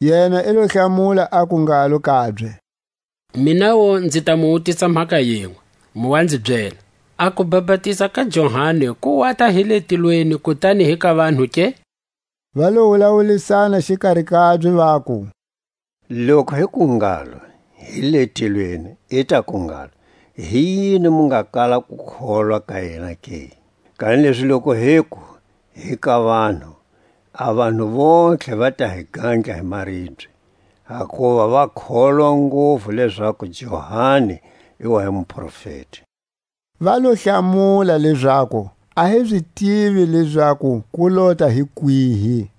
Yena i lo hlamula, aku ngalo kabye: Minawu nzi ta mu wutisa mhaka yinwe; mu wa nzi byela: A kubapatiza ka Johani ku wata hi le tilweni, kutani hi ka vanhu ke? Va lo wulawulisana xikari kabye, vaku: Loku hiku ngalo: Hi le tilweni; i taku ngalo: Hi yini mu nga kala ku kholwa ka yena ke? Kanilezi loku hiku: Hi ka vanhu; a vanhu vontlhe va ta hi gandla hi maribye; hakuva va kholwa nguvu lezaku Johani i wa hi muprofeti. Va lo hlamula lezaku, A hi zi tivi lezaku ku lota hi kwihi.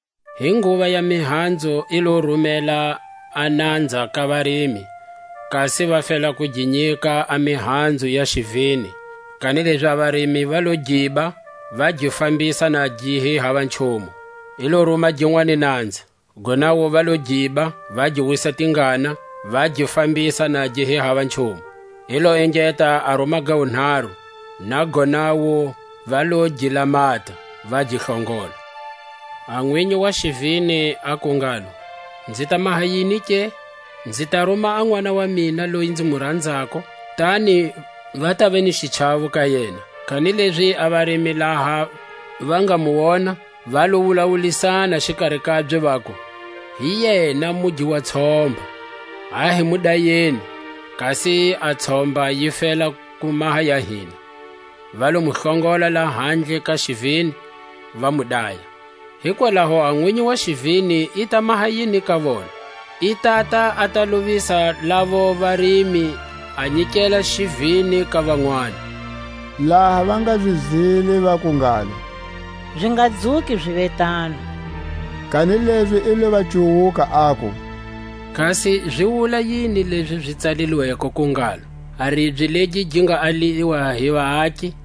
Hi nguva ya mihanzu i lo rumela a nanza ka varimi, kasi va fela ku gi nyika a mihanzu ya xivini; kanilezi a varimi va lo giba, va gi fambisa na gi hi hava nchumu. I lo ruma ginwani nanza; gonawu va lo giba, va gi wisa tingana, va gi fambisa na gi hi hava nchumu. I lo engeta a ruma ga wunharu; na gonawu va lo gi lamata, va gi hlongola. A nwinyi wa xivini aku ngalo: Nzi ta maha yini ke? Nzi ta ruma a nʼwana wa mina loyi nzi mu ranzako, kutani va tava ni xichawo ka yena. Kanilezi a varimi laha va nga mu wona, va lo wulawulisana xikari kabye, vaku: Hi yena mugi wa tshomba; a hi mu dayeni, kasi a tshomba yi fela ku maha ya hina. Va lo mu hlongola lahandle ka xivini, va mu daya. Hikwalaho a nwinyi wa xivini i ta maha yini ka vona? I tata a ta lovisa lavo varimi, a nyikela xivini ka vanwani. Laha va nga zi zwile, vaku ngalo: Zi nga dzuki ziva tano! Kanilezi i lo va cuwuka, aku: Kasi zi wula yini lezi zi tsalilweko, ku ngalo: A ribye legi gi nga aliwa hi vaaki,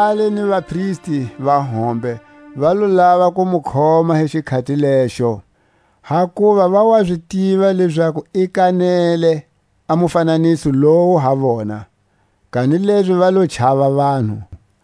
A vatsali ni vapristi va hombe va lo lava ku mu khoma hi xikhati lexo; hakuva va wa zi tiva lezaku i kanele a mufananiso lowu ha vona; kanilezi va lo chava vanhu.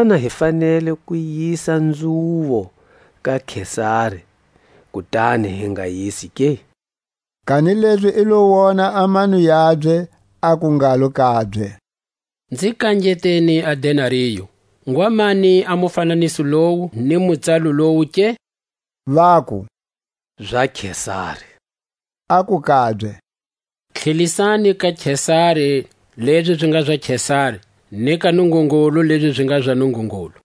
Xana hi fanele ku yisa nzhuvo ka Kesari, kutani hi nga yisi ke? Kanilezi i lo wona a mano yabye, aku ngalo kabye: Nzi kangeteni a denario. Ngwa mani a mufananiso lowu, ni mutsalo lowu ke? Vaku: Za Kesari. Aku kabye: Tlhelisani ka Kesari lezi zi nga za Kesari, ni ka Nungungulu lezi zi nga za Nungungulu.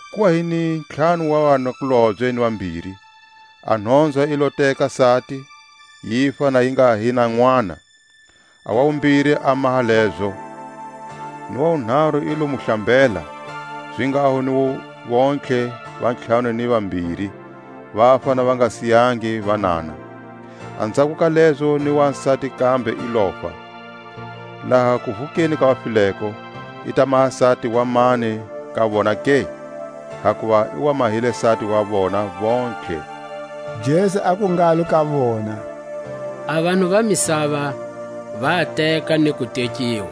Ku wa hi ni ntlhanu wa vanakulobye ni vambiri; a nhonzwa yi lo teka sati, yifa na yi nga hi na nʼwana; a wa wumbiri a maha zalezo; ni wa wunharu i lo mu hlambela; zinghaho ni vontlhe va ntlhanu ni vambiri, vafa na va nga siyangi vanana. Anzhako ka lezo ni wasati kambe i lofa. Laha kuvukeni ka vafileko, i ta maha sati wa mani ka vona ke? Hakuva i wa mahile sati wa vona vontlhe. Jesu aku ngalo ka vona: A vanhu va misava va teka, ni ku tekiwa;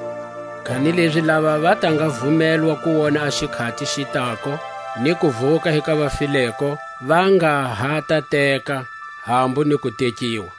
kanilezi lava va ta nga vumelwa ku wona a xikhati xi tako, ni kuvuka hi ka vafileko, va nga ha ta teka, hambu ni ku tekiwa;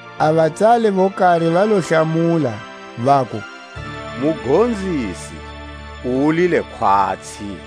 A vatsali vo kari va lo hlamula, vaku: Mugonzisi, u wulile khwatsi.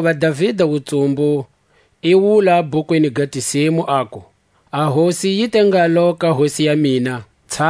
Hakuva Davida wutsumbu i wula bhukwini ga Tisimu, aku: A Hosi yi te ngalo ka Hosi ya mina,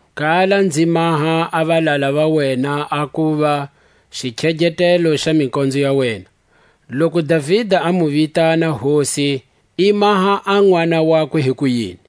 kala nzi maha a valala va wena a kuva: Xikhegetelo xa mikonzo ya wena. Loku Davida a mu vitana Hosi, i maha a nʼwana wakwe hikuyini?